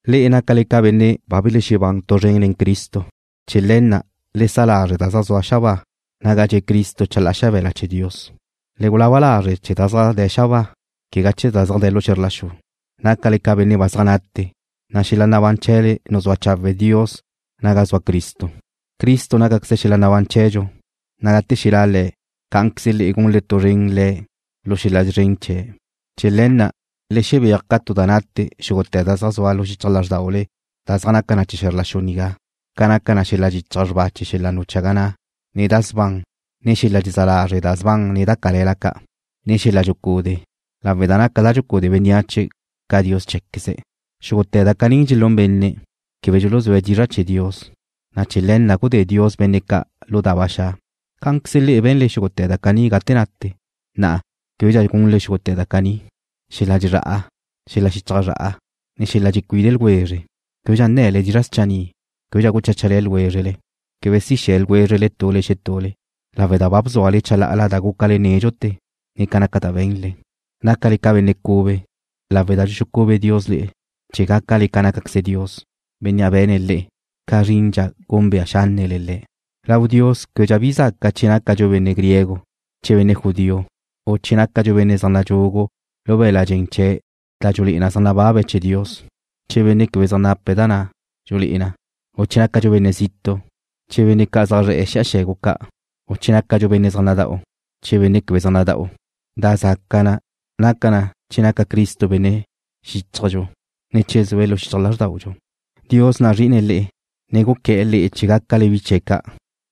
Le'e nácale ca benne' ba belexebán tu zren nen Cristo. Chee̱ le̱ na' le sa lazre' da zaj zua xabáa, naga dxe' Cristo chalá'a xabe̱la chee̱ Dios. Le gulaba lazre' chee̱ da zaj de̱ xabáa, quegá chee̱ da zaj de̱ lu xe̱zr la xu. Nácale ca benne' ba zaj nate, na' xel-la nabán chee̱le nuzúa chawe' Dios naga zua Cristo. Cristo nácaqueze xel-la nabán chee̱dxu, na' gate xelá' Le̱', cá'anqueze le'e gunle tu zren Le̱' lu xel-la szren chee̱'. Chee̱ le̱ na', le xebéaj ca tu da nate xúgute̱ da zaj zua lu xichaj lázrdaule da zaj naca na chee̱ xe̱zr la xu nigá, ca naca xel-la dxichaj na xrba chee̱ xel-la nuchaga na', ne da sban, ne xel-la dxezá lazre' da sban ne da cale̱la ca', ne xel-la dxucude', lawe' da naca da dxucude bénneache ca dios chee̱queze̱'. Xúgute̱ da caní dxelún benne' quebe dxuluzúe̱' dizra' chee̱ Dios, na' chee̱ le̱ na' gudé Dios benne' ca' lu da ba xa'. Cá'anqueze le'e be̱nle xúgute̱ da caní gate nate. Na'a, québedxa gunle xúgute̱ da caní: Xel-la dxezrá'a, ne xel-la xichaj zra'a, ne xel-la dxecuide ljwezre. Québedxa nne̱le dizra' schanni'. Québedxa gucháchale ljwézrele. Quebe si xe̱ ljwézrele tule xetule, lawe' da ba bzúale chalá'ala da gúcale nédxute̱, ne ca naca da be̱nle. Nácale ca benne' cube, lawe' da dxuxucube Dios le'e chee̱ gácale ca nácaqueze Dios, Bénnea' be̱ne̱' le'e, ca zrindxa gúnbea xánnele Le̱'. Lau Dios québedxa bi zaca che nácadxu benne' griego, che benne' judío, u che nácadxu benne' zaj nadxugu lu be̱l-la' dxen chee̱' da dxulé'e na zaj nababe̱' chee̱ Dios, che benne' quebe zaj nape̱' da na' dxulé'e na, u che nácadxu benne' zitu', che benne' ca' zaj zre̱'e̱ xi'a xe̱gu ca', u che nácadxu benne' zaj nada'u, che benne' quebe zaj nada'u. Da zaca na naca na che naca Cristo benne' xíchajdxu, ne che zue̱' lu xichaj lázrdaudxu. Dios nazri'ine̱' le'e, ne guqué̱'e̱ le'e chee̱ gácale bi chee̱' ca'.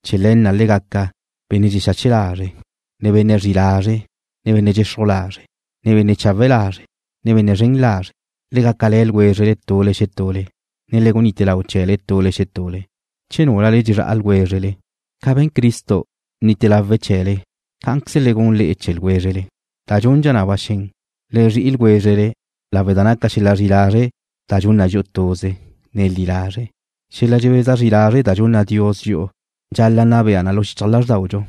Chee̱ le̱ na' le gaca: Benne' dxexache lazre', ne benne' zri'i lazre', ne benne' dxexruj lazre', ne benne' chawe' lazre', ne benne' zren lazre'. Le gácale̱ ljwézrele tule xetule, ne le gunite lau chee̱le tule xetule, che núlale dxezrá'a ljwézrele. Ca be̱n Cristo, bnite lawe̱' chee̱le, cá'anqueze le gun le'e chee̱ ljwézrele. Da dxundxa na ba xen, le zri'i ljwézrele lawe' da naca xel-la zri'i lazre' da dxun na dxi'u tuze, ne li lazre'. Xel-la dxebeza zri lazre' da dxunna Dios dxi'u dxal-la' nna bea na lu xichaj lázrdaudxu,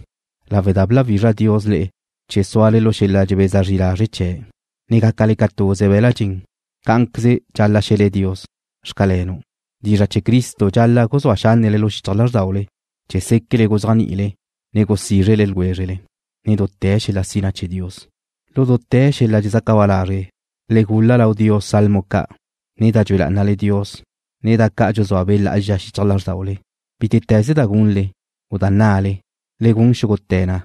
lawe' da bláwizra Dios le'e chee̱ súale lu xel-la dxebeza zri lazre' chee̱', ne gácale ca tuze be̱l-la' dxen. Cá'anqueze dxal-la' xe̱le Dios: Xcalenu'. Dizra' chee̱ Cristo dxal-la' guzúa xánnele lu xichaj lázrdaule chee̱ séquele guzéajni'ile, ne gusízre ljwézrele nen dute̱ xel-la sina chee̱ Dios. Lu dute̱ xel-la dxezaca ba lazre' le gul-la lau Dios salmo ca', ne da dxue lá'anale Dios, ne da ca' dxuzúa Be' Lá'azxa xichaj lázrdaule. Bítete̱ze da gunle, u da nnale, le gun xúgute̱ na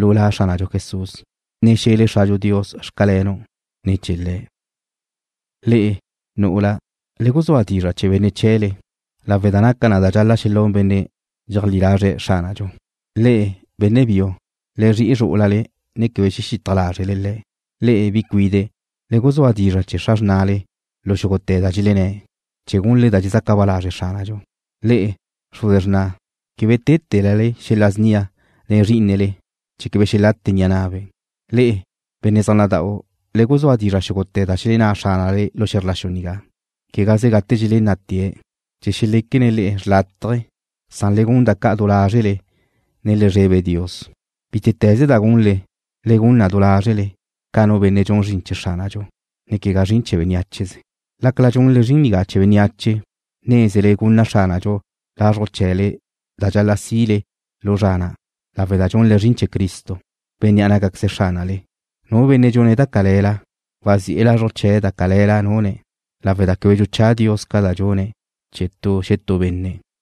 lu La Xránadxu Jesús, ne xe̱le Xradxu Dios: Xcalenu', ne̱ chee̱ Le̱'. Le'e, nu'ula, le guzúa dizra' chee̱ benne' chee̱ chee̱le, lawe' da naca na da dxal-la' xelún benne' dxeajlí lazre̱' Xránadxu. Le'e, benne' biu, le zri'i zrú'ulale, ne quebe xexitaj lázrele le̱'. Le'e, bi cuide', le guzúa dizra' chee̱ xra xrnale lu xúgute̱ da dxelenné̱', chee̱ gunle da dxezaca ba lazre' Xránadxu. Le'e, xruze xrna', quebe téte̱lale xel-la snia nen zrí'inele, chee̱ quebe xelate ni'a na'be'. Le'e, benne' zaj nada'u, le guzúa dizra' xúgute̱ da xelenná xránale lu xe̱zr la xu nigá, quegaze gate dxelenná'tee̱', chee̱ xeléquene̱' le'e xrlátaje, san le gun da ca' du lázrele, ne le zrebe Dios. Bítete̱ze da gunle, le gun na du lázrele, ca nu benne' dxune̱' zrin chee̱ Xránadxu, ne quegá zrin chee̱ beniácheze. Lácala dxunle zrin nigá chee̱ bénneache, nézele gunna Xránadxu lazruj chee̱le da dxal-la' sile lu zra na', lawe' da dxunle zrin chee̱ Cristo, Bénnea' nácaqueze̱' Xránale. Nu benne' dxune̱' da cale̱la, wazi'e̱ lazruj chee̱ da cale̱la nune̱' lawe' da quebe dxuchá Dios ca da dxune̱' chee̱ tu xetú benne'.